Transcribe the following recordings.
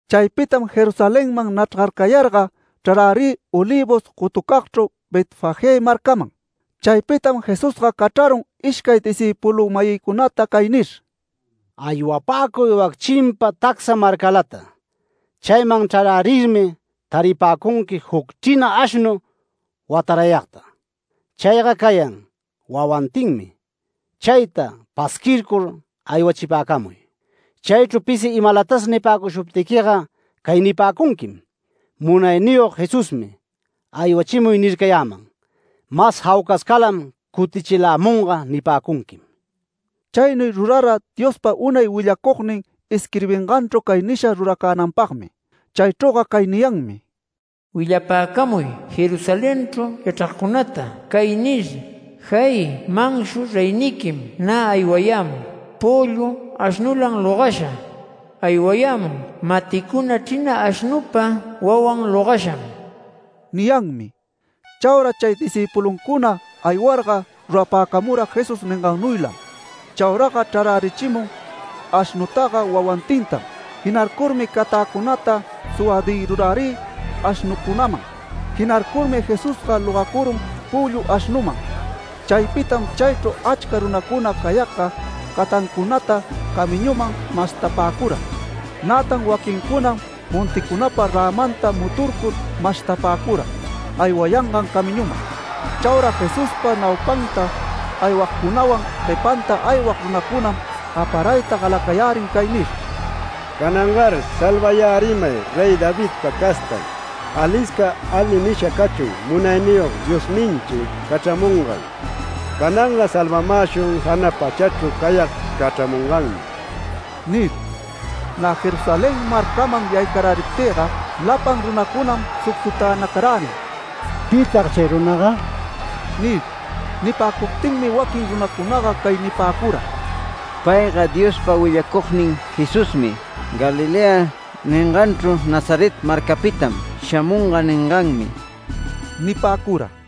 Chaypitam Jerusalenman nachrgarcayarga, chrarärï Olivos gotucagchru Betfagé marcaman. Chaypitam Jesusga cachrarun ishcay discïpulu-mayicunata cay nir: “Aywapäcuy wac chimpa tacsa marcalata. Chayman chrarärirmi taripäcunqui juc chrina ashnu watarayagta. Chayga cayan wawantinmi. Chayta pasquircur aywachipäcamuy. Chaychru pisi imalatas nipäcushuptiquiga cay nipäcunquim: ‘Munayniyog Jesusmi aywachimuy nircayäman. Mas jaucascalam cutichilämunga’ nipäcunquim”. Chaynuy rurara Diospa unay willacugnin isquirbinganchru cay nisha ruracänanpagmi. Chaychrüga cay niyanmi: “Willapäcamuy Jerusalenchru yachragcunata cay nir: ¡Jay! manshu reyniquim nä aywayämun, püllu ashnulan logasha. Aywayämun maticuna chrina ashnupa wawan logasham” niyanmi. Chaura chay discïpuluncuna aywarga rurapäcamura Jesús ningannuylam. Chauraga chrarärichimun ashnutaga wawantintam. Jinarcurmi catäcunata suwadïrurärï ashnucunaman. Jinarcurmi Jesusga logacurun püllu ashnuman. Chaypitam chaychru achca runacuna cayagga catancunata camiñuman mashtapäcura. Nätan waquincunam monticunapa rämanta muturcur mashtapäcura aywayangan camiñuman. Chaura Jesuspa naupanta aywagcunawan guepanta aywag runacunam gaparayta galacayärin cay nir: “¡Canangar salvayärimay Rey Davidpa castan! Alisca ali nisha cachun Munayniyog Diosninchi cachramungan. Cananga salvamäshun jana pachachru cayag cachramunganmi” nir. Nä Jerusalén marcaman yaycaräriptïga lapan runacunam sucsutänacarärin “¿Pitag chay runaga?” nir. Nipäcuptinmi waquin runacunaga cay nipäcura: “Payga Diospa willacugnin Jesusmi, Galilea ninganchru Nazaret marcapitam shamunga ninganmi” nipäcura.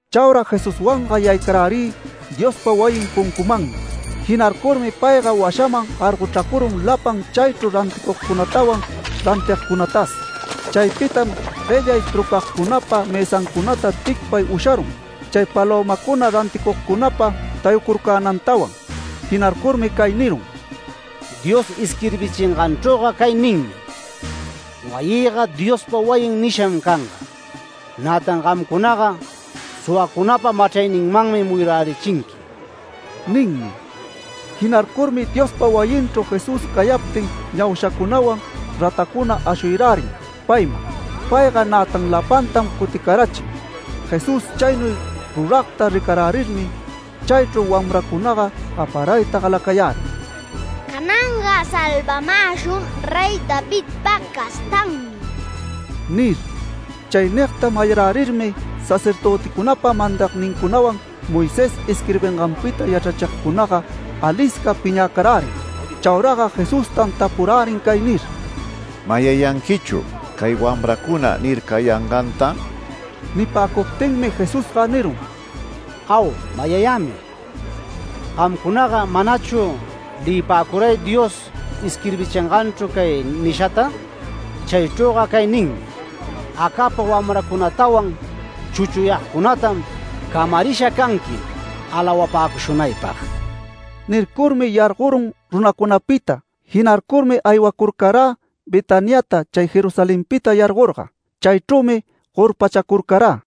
Chaura Jesuswanga yaycarärï Diospa wayin puncumanmi. Jinarcurmi payga washaman gargochracurun lapan chaychru ranticugcunatawan rantigcunatas. Chaypitam guellay trucagcunapa mësancunata ticpay usharun, chay palömacuna ranticugcunapa tayucurcänantawan. Jinarcurmi cay nirun: “Dios isquirbichinganchrüga cay ninmi: ‘Wayïga Diospa wayin’ nisham canga. ¡Nätan gamcunaga suwacunapa machrayninmanmi muyurärichinqui!” ninmi. Jinarcurmi Diospa wayinchru Jesús cayaptin ñaushacunawan ratacuna ashuyarärin payman. Payga nätan lapantam cuticarachin. Jesús chaynuy ruragta ricarärirmi, chaychru wamracunaga gaparayta galacayärin “¡Cananga salvamäshun Rey Davidpa castanmi!” nir. Chay nigta mayarärirmi sacerdöticunapa mandagnincunawan Moisés isquirbinganpita yachrachigcunaga alisca piñäcarärin. Chauraga Jesustam tapurärin cay nir: “¿Mayayanquichu cay wamracuna nircayanganta?” Nipäcuptinmi Jesusga nirun: “Au, mayayämi. ¿Gamcunaga manachu leyipäcuray Dios isquirbichinganchru cay nishata? Chaychrüga cay ninmi: ‘Acapa wamracunatawan chuchuyagcunatam camarisha canqui alawapäcushunaypag’”. Nircurmi yargorun runacunapita. Jinarcurmi aywacurcarä Betaniata chay Jerusalenpita yargorga. Chaychrümi gorpachacurcarä.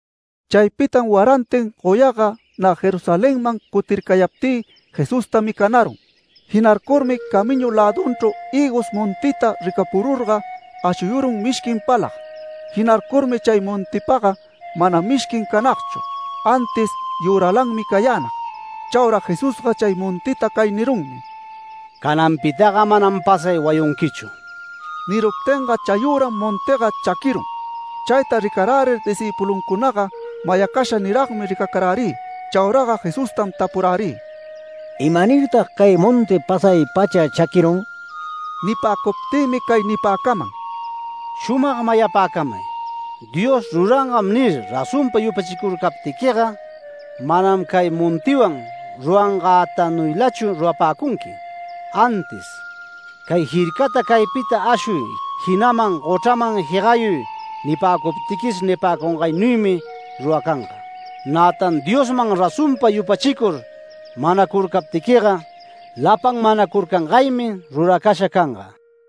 Chaypitam warantin goyaga nä Jerusalenman cutircayaptï, Jesusta micanarun. Jinarcurmi camiñu lädunchru hïgos montita ricapururga ashuyurun mishquin palag. Jinarcurmi chay montipaga mana mishquin canagchu, antis yüralanmi cayänag. Chaura Jesusga chay montita cay nirunmi: “Cananpitaga manam pasay wayunquichu”. Niruptinga chayüram montiga chaquirun. Chayta ricarärir discïpuluncunaga mayacasha niragmi ricacarärï. Chauraga Jesustam tapurärï: “¿Imanirtag cay monti pasay-pacha chaquirun?” Nipäcuptïmi cay nipäcaman: “Shumag mayapäcamay: Dios rurangan nir razonpa yupachicurcaptiquiga, manam cay montiwan rurangänuylatachu rurapäcunqui. Antis ‘Cay jircata caypita ashuy, jinaman gochraman jegayuy nipäcuptiquis’ nipäcungaynuymi ruracanga. Nätan Diosman razonpa yupachicur manacurcaptiquiga, lapan manacurcangaymi ruracasha canga”.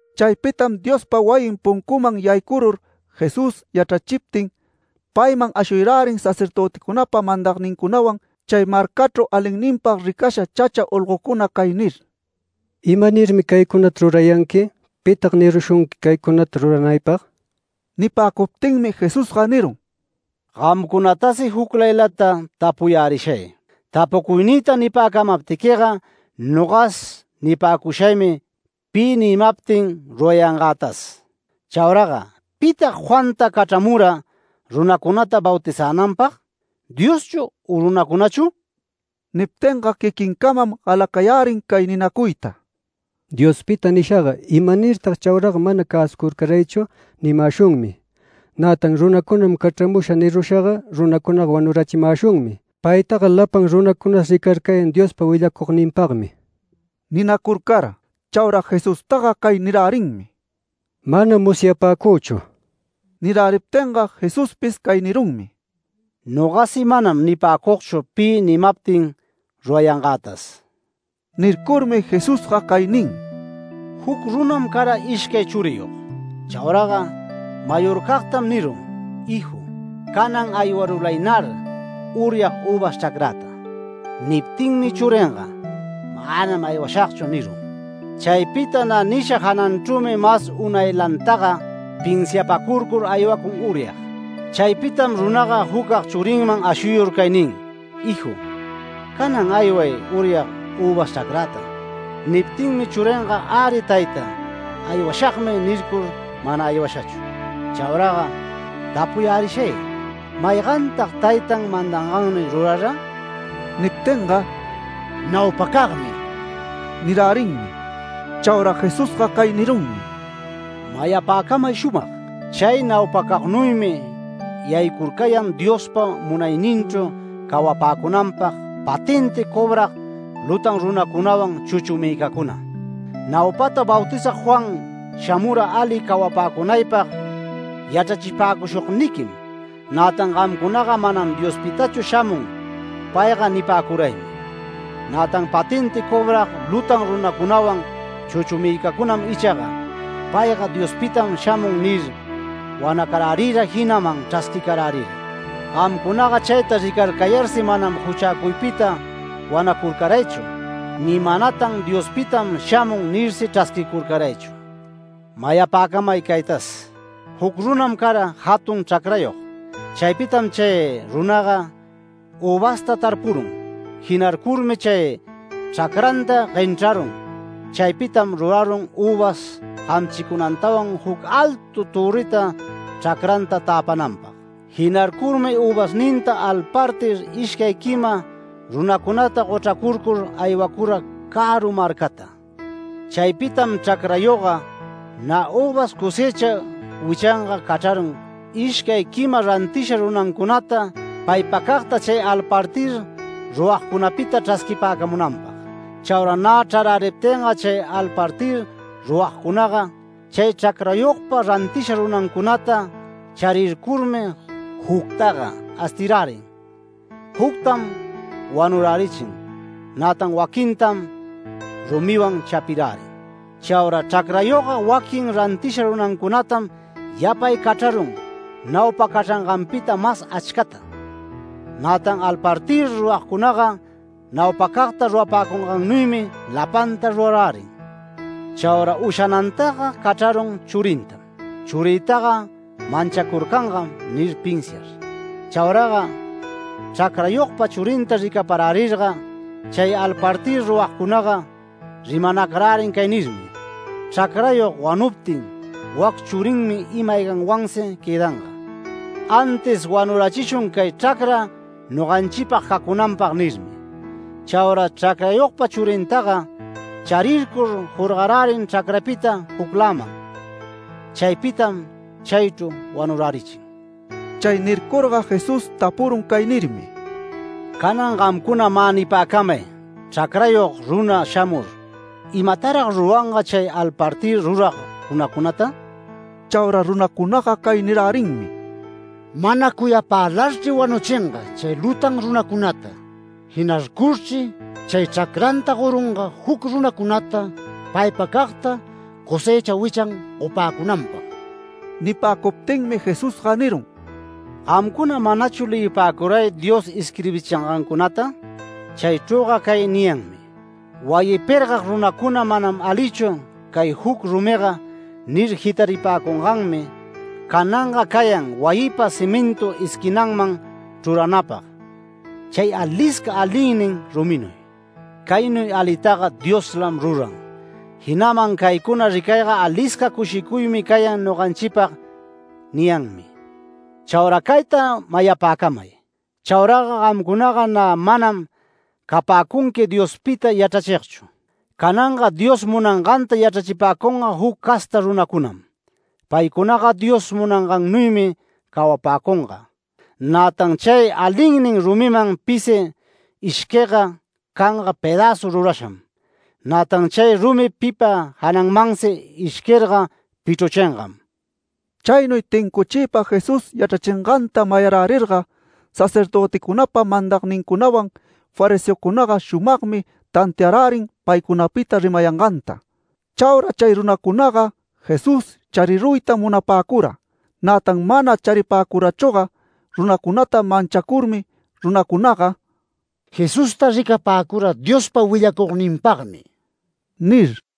Chaypitam Diospa wayin puncuman yaycurur Jesús yachrayächiptin, payman ashuyarärin sacerdöticunapa mandagnincunawan chay marcachru alinninpag ricasha chacha olgocuna cay nir: “¿Imanirmi caycunata rurayanqui? ¿Pitag nirushunqui caycunata ruranaypag?” Nipäcuptinmi Jesusga nirun: “Gamcunatasi juclaylata tapuyärishay. Tapucuynïta nipäcamaptiquiga nogas nipäcushaymi pi nimaptin rurayangätas. Chauraga ¿pitag Juanta cachramura runacunata bautizänanpag? ¿Dioschu u runacunachu?” Niptinga quiquincamam galacayärin cay ninacuyta “ ‘Diospita’ nishaga, ‘¿Imanirtag chauraga mana cäsucurcaraychu?’ nimäshunmi. Nätan ‘Runacunam cachramusha’ nirushaga, runacunaga wanurachimäshunmi. Paytaga lapan runacunas ricarcayan Diospa willacugninpagmi” ninacurcara. Chaura Jesustaga cay nirärinmi: “Manam musyapäcüchu”. Niräriptinga Jesuspis cay nirunmi: “Nogasi manam nipäcugchu pi nimaptin rurayangätas”. Nircurmi Jesusga cay nin: “Juc runam cara ishcay churiyog. Chauraga mayorcagtam nirun: ‘Hiju, canan aywarulaynar uryag üvas chracräta’. Niptinmi churinga ‘Manam aywashagchu’ nirun. Chaypita nä nisha jananchrümi mas unaylantaga pinsiapacurcur aywacun uryag. Chaypitam runaga jucag churinman ashuyur cay nin: ‘Hiju, canan ayway uryag üvas chracräta’. Niptinmi churinga ‘Äri tayta, aywashagmi’ nircur mana aywashachu. Chauraga tapuyärishay: ¿Maygantag taytan mandangannuy rurara?” Niptinga “Naupacagmi” nirärinmi. Chaura Jesusga cay nirunmi: “Mayapäcamay shumag: Chay naupacagnuymi yaycurcayan Diospa munayninchru cawapäcunanpag patenti cobrag lutan runacunawan chuchumïcacuna. Naupata Bautizag Juan shamura ali cawapäcunaypag yachrachipäcushugniquim, nätan gamcunaga ‘Manam Diospitachu shamun payga’ nipäcuraymi. Nätan patenti cobrag lutan runacunawan chuchumïcacunam ichaga ‘Payga Diospitam shamun’ nir wanacarärira jinaman chrasquicarärira. Gamcunaga chayta ricarcayarsi manam juchäcuypita wanacurcaraychu, ni manatan Diospitam shamun nirsi chrasquicurcaraychu. Mayapäcamay caytas: Juc runam cara jatun chracrayog. Chaypitam chay runaga üvasta tarpurun. Jinarcurmi chay chracranta guenchrarun. Chaypitam rurarun üvas gamchicunantawan juc altu törrita chracranta täpananpag. Jinarcurmi üvasninta alpartir ishcay quima runacunata gochracurcur aywacura caru marcata. Chaypitam chracrayogga nä üvas cosëcha wichanga cachrarun ishcay quima rantisha runancunata paypacagta chay alpartir ruragcunapita chrasquipäcamunanpag. Chaura nä chraräriptinga chay alpartir ruragcunaga, chay chracrayogpa rantisha runancunata charircurmi juctaga astirärin, juctam wanurärichin, nätan waquintam rumiwan chapirärin. Chaura chracrayogga waquin rantisha runancunatam yapay cachrarun naupa cachranganpita mas achcata. Nätan alpartir ruragcunaga naupacagta rurapäcungannuymi lapanta rurarärin. Chaura ushanantaga cachrarun churintam ‘Churïtaga manchacurcangam’ nir pinsiar. Chauraga chracrayogpa churinta ricaparärirga, chay alpartir ruragcunaga rimanacarärin cay nirmi: ‘Chracrayog wanuptin wac churinmi ima-ayganwansi quëdanga. Antis wanurachishun cay chracra noganchipag cacunanpag’ nirmi. Chaura chracrayogpa churintaga charircur jorgarärin chracrapita jucläman. Chaypitam chaychru wanurärichin”. Chay nircurga Jesús tapurun cay nirmi: “Canan gamcuna mä nipäcamay chracrayog runa shamur ¿imatarag ruranga chay alpartir rurag runacunata?” Chaura runacunaga cay nirärinmi: “Mana cuyapälarchri wanuchinga chay lutan runacunata. Jinarcurchri chay chracranta gorunga juc runacunata paypacagta cosëcha wichan gopäcunanpag”. Nipäcuptinmi Jesusga nirun: “¿Gamcuna manachu leyipäcuray Dios isquirbichingancunata? Chaychrüga cay niyanmi: ‘Wayi pergag runacuna “Manam alichu cay juc rumiga” nir jitaripäcunganmi cananga cayan wayipa cimintu esquinanman chruranapag, chay alisca alinnin ruminuy. Caynuy alitaga Dioslam ruran. Jinaman caycuna ricayga alisca cushicuymi cayan noganchipag’ niyanmi. Chaura cayta mayapäcamay: Chauraga gamcunaga nä manam capäcunqui Diospita yachrachigchu. Cananga Dios munanganta yachrachipäcunga juc casta runacunam. Paycunaga Dios munangaynuymi cawapäcunga. [Nätan chay alinnin rumiman pisi ishquigga canga pedäzu rurasham. Nätan chay rumi pipa janamansi ishquirga pichruchingam.]” Chaynuy tincuchiypa Jesús yachrachinganta mayarärirga sacerdöticunapa mandagnincunawan fariseocunaga shumagmi tantiarärin paycunapita rimayanganta. Chaura chay runacunaga Jesús chariruytam munapäcura, nätan mana charipäcurachüga runacunata manchacurmi, runacunaga “Jesusta ricapäcura Diospa willacugninpagmi” nir.